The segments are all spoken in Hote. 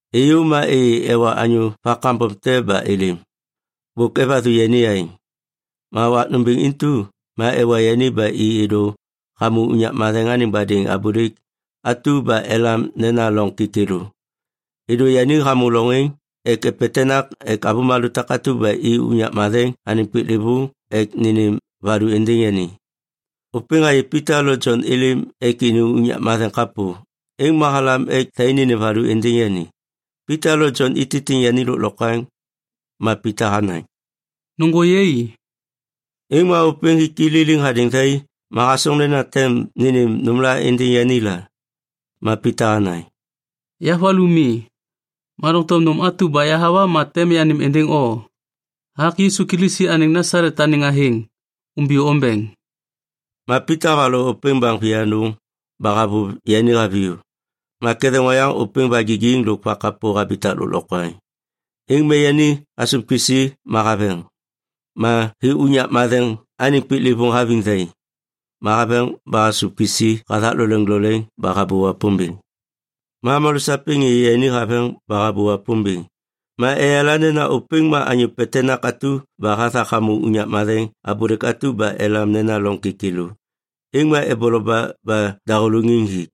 Êyô ma êyê ewa anyô va kambom te ba êlêm. Bôk evathu yani aêŋ. Ma wak nômbêŋ intu ma ewa yani ba i êdô hamô unyak matheŋ anêŋ badêŋ abôlêk atu ba elam nena Loŋ Kêkêlô. Êdô yani hamô loŋ êŋ ek epetenak ek avômalô takatu ba i unyak matheŋ anêŋ piklêvôŋ ek nênêm valu êndêŋ yani. Ôpêŋ hayê Pita lo Jon êlêm ek ini unyak matheŋ kapô, êŋ ma halam ek thai nênêm valu êndêŋ yani. Pita lo Jon ititiŋ yani lôklokwaŋ. Ma Pita hanaŋ, “Nôŋgô yai!” Êŋ ma ôpêŋ hik i liliŋ hadêŋ thai ma hasoŋ nena tem nênêm nômla êndêŋ yani la. Ma Pita hanaŋ, “Ya valu mi. Ma doŋtom nôm atu ba yahawa ma tem yanêm êndêŋ o. Hathak Yisu Kilisi anêŋ Nasalet anêŋ athêŋ, umbiyô ombeŋ.” Ma Pita havaloŋ ôpêŋ baŋ vianôŋ ba havôv yani haviyô. Ma ketheŋ oyaŋ ôpêŋ vagigiŋ lôk vakapô habitak lôklokwaŋ. Êŋ ma yani hasôv kisi ma haveŋ. Ma hi unyak matheŋ anêŋ piklêvôŋ haviŋ thai. Ma haveŋ ba hasôv kisi hathak loleŋ loleŋ ba habô Wapômbêŋ. Ma avômalô sapêŋ êyê yani haveŋ ba habô Wapômbêŋ. Ma eyala nena ôpêŋ ma anyô petenak atu ba hathak hamô unyak matheŋ abôlêk atu ba elam nena Loŋ Kêkêlô, êŋ ma eboloba ba dahôlôŋiŋ hi.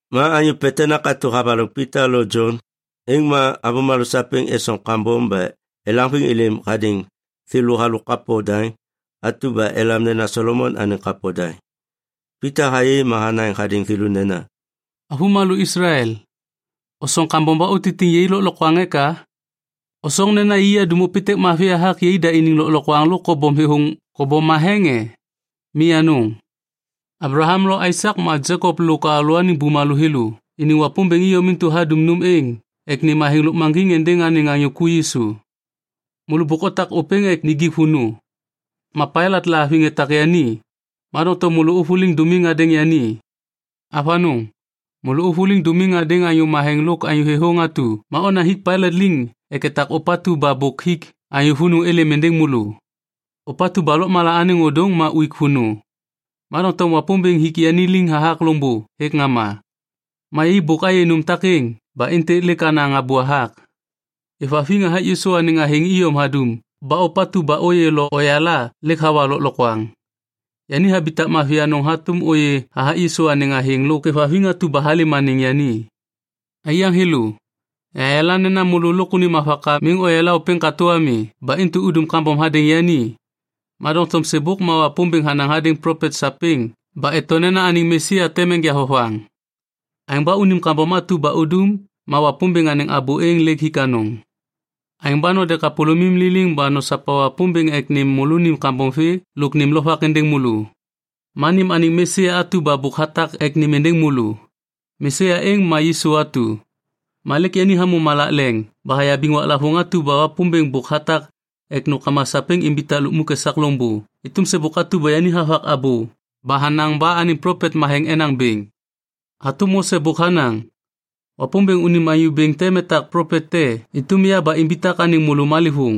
Ma anyô petenak atu havaloŋ Pita lo Jon, êŋ ma avômalô sapêŋ esoŋ kambom ba elaŋviŋ êlêm hadêŋ thêlô halôk kapo daŋ atu ba elam nena Solomon anêŋ Kapo Daŋ. Pita hayê ma hanaŋ hadêŋ thêlô nena, “Avômalô Islael, osoŋ kambom ba utitiŋ yai lôklokwaŋ eka? Osoŋ nena yai adum ôpêntêk mavi hathak yaidaniŋ lôklokwaŋ lôk kobom matheŋ e? Mi anôŋ! Ablaham lo Aisak ma Jekop lôk alalôaniŋ bumalô thêlô iniŋ Wapômbêŋ iyom intu hadum nôm êŋ ek nêm athêŋ lôkmaŋgiŋ êndêŋ anêŋ anyô ku Yisu. Môlô bôk otak ôpêŋ ek nijik vônô. Ma Pailat lahaviŋ etak yani, ma doŋtom môlô ôvôliŋ dômim hadêŋ yani. Avanôŋ, môlô ôvôliŋ dômim hadêŋ Anyô Matheŋ lôk Anyô Thêthôŋ atu ma onaŋ hik Pailat liŋ ek etak ôpatu ba bôk hik anyô vônô êlêm êndêŋ môlô. Ôpatu ba lôkmala anêŋ ôdôŋ ma uik vônô. Ma doŋtom Wapômbêŋ hik yani liŋ hathak loŋbô hêk ŋama. Ma yai bôk ayê nôm takêŋ ba êntêk lêk anaŋ abô hathak. Êvhaviŋ hathak Yisu anêŋ athêŋ iyom hadum ba ôpatu ba ôyê lo oyala lêk hawa lôklokwaŋ. Yani habitak mavi anôŋ hatôm ôyê hathak Yisu anêŋ athêŋ lôk êvhaviŋ atu ba halêm anêŋ yani. “Aiyaŋ thêlô, yahayala nena môlô lôk unim avaka miŋ oyala ôpêŋ katô ami ba intu udum kambom hadêŋ yani. Ma doŋtom sêbôk ma Wapômbêŋ hanaŋ hadêŋ plopet sapêŋ ba eto nena anêŋ Mesia tem enja vovaŋ. Aêŋ ba unim kambom atu udum ma Wapômbêŋ anêŋ abô êŋ lêk hik anôŋ. “Aêŋ ba node kapôlômim liliŋ ba nosopa Wapômbêŋ ek nêm môlônim kambom vê lôk nêm lovak êndêŋ môlô. Ma nêm anêŋ Mesia atu ba bôk hatak ek nêm êndêŋ môlô. Mesia êŋ ma Yisu atu. Ma lêk yani hamô malak leŋ ba hayabiŋ waklavôŋ atu ba Wapômbêŋ bôk hatak ek nômkama sapêŋ imbitak lukmuk esak loŋbô êtôm sêbôk atu ba yani havak abô ba hanaŋ ba anêŋ plopet matheŋ enaŋ bêŋ. Hatôm Mose bôk hanaŋ, ‘Wapômbêŋ unim Anyô Bêŋ tem etak plopet te êtôm ya ba imbitak anêŋ môlô malêvôŋ.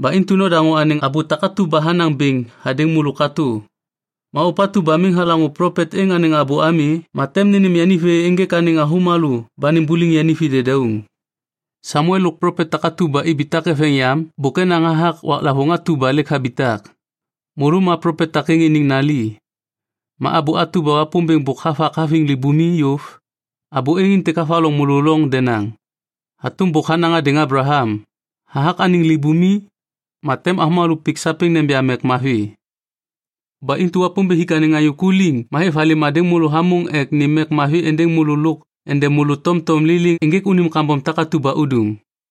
Ba intu nodaŋô anêŋ abô takatu ba hanaŋ bêŋ hadêŋ môlô katô. Ma ôpatu ba miŋ halaŋô plopet êŋ anêŋ abô ami, ma tem nênêm yani vê ênjêk anêŋ avômalô ba nimbuliŋ yani vi dedauŋ.’ “Samuel lôk plopet takatu ba ibitak eveŋ yam bôk enaŋ hathak waklavôŋ atu ba lêk habitak. Môlô ma plopet takêŋ iniŋ nali. Ma abô atu ba Wapômbêŋ bôk havak haviŋ libumi yôv, abô êŋ êntêk havaloŋ môlô loŋ denaŋ. Hatôm bôk hanaŋ hadêŋ Ablaham, ‘Hathak anêm libumi, ma tem avômalô pik sapêŋ neja mek mavi.’ Ba intu Wapômbêŋ hik anêŋ anyô ku liŋ ma hêv halêm hadêŋ môlô hamôŋ ek nêm mek mavi êndêŋ môlô lôk ende môlô tomtom liliŋ ênjêk unim kambom takatu ba udum.”